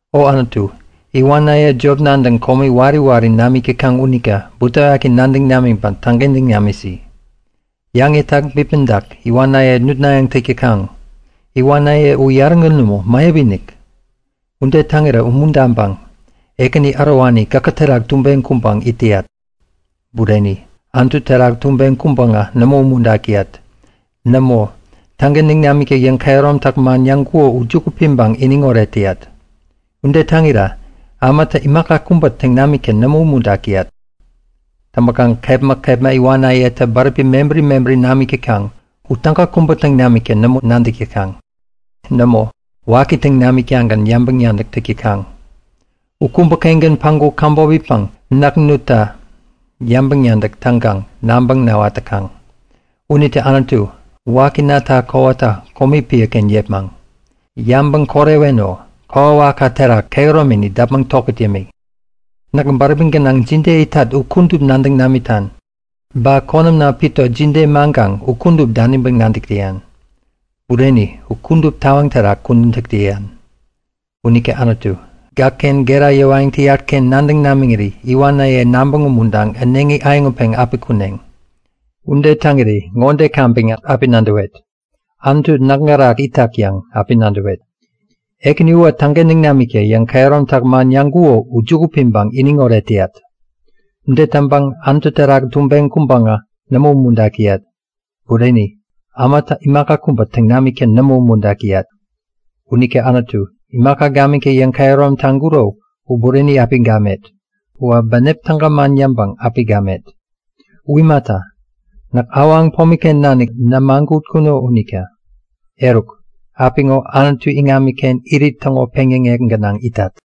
O Anutu, iwanaye jop nadäŋ komi wari wari namik täkaŋ unita butewaki nadäŋ namiŋpäŋ täŋkentäŋ namisi! Yäŋetak bipmäŋtak iwanaye nutnayäŋ täk täkaŋ. Iwanaye u yarägän nämo, mäyap-inik. Ude täŋirä umuntaŋpäŋ, Ekäni ärowani, gäkä terak tubeŋ kuŋpäŋ it täyat. Bureni, Anutu terak tubeŋ kuŋpäŋä nämo umuntak täyat. Nämo, täŋkentäŋ namikta yäŋkehäromtak man yäŋkuko u juku piŋpäŋ iniŋoret täyat. Ude täŋira ämatä imaka kubä täŋ namikta nämo umuntak täyat. Täŋpäkaŋ kepma kepma iwanayetä bäräpi mebäri mebäri namik täkaŋ. U täga kubä täŋ namikta nämo nadäk täkaŋ. Nämo, waki täŋ namiktagän yäŋpäŋ-nadäk täk täkaŋ. U kubäkengän päŋku käbop itpäŋ näk nutta yäŋpäŋ-nadäk täŋkaŋ nabäŋ näwat täkaŋ. Unita Anutu, wakinita kowata komi piäken yepmaŋ! Yabäŋ koreweno! Kokwawakka terak kehäromini däpmäŋ tokät yämi. Näk bäräpi gänaŋ jide itat u kudup nadäŋ namitan. Ba konämna pito jide mäŋkaŋ u kudup daniŋpäŋ nadäk täyan. Bureni, u kudup tawaŋ terak kudän täk täyan. Unita Anutu, gäkken gera yäwayäŋ täyatken nadäŋ namiŋiri iwanaye nabäŋ umuntaŋpäŋ äneŋi äyäŋutpeŋ api kuneŋ. Ude täŋiri ŋode kaŋpäŋ api nadäwet; Anutu näk gärak itak yäŋ api nadäwet. Ekäni uwä täŋkentäŋ namikta yäŋkehäromtak man yäŋkuko u juku piŋpäŋ iniŋoret täyat. Ude täŋpäŋ Anutu terak tubeŋ kuŋpäŋä nämo umuntak täyat. Bureni, ämatä imaka kubä täŋ namikta nämo umuntak täyat. Unita Anutu, imaka gamikta yäŋkehärom taŋkuro u bureni api gamet. Uwä bänep täga man yäŋpäŋ api gamet. U imata, näk awaŋ pomiken nanik nämagutkuno unita. Eruk, apiŋo Anutu iŋamiken irit täŋo peŋyäŋek gänaŋ itat.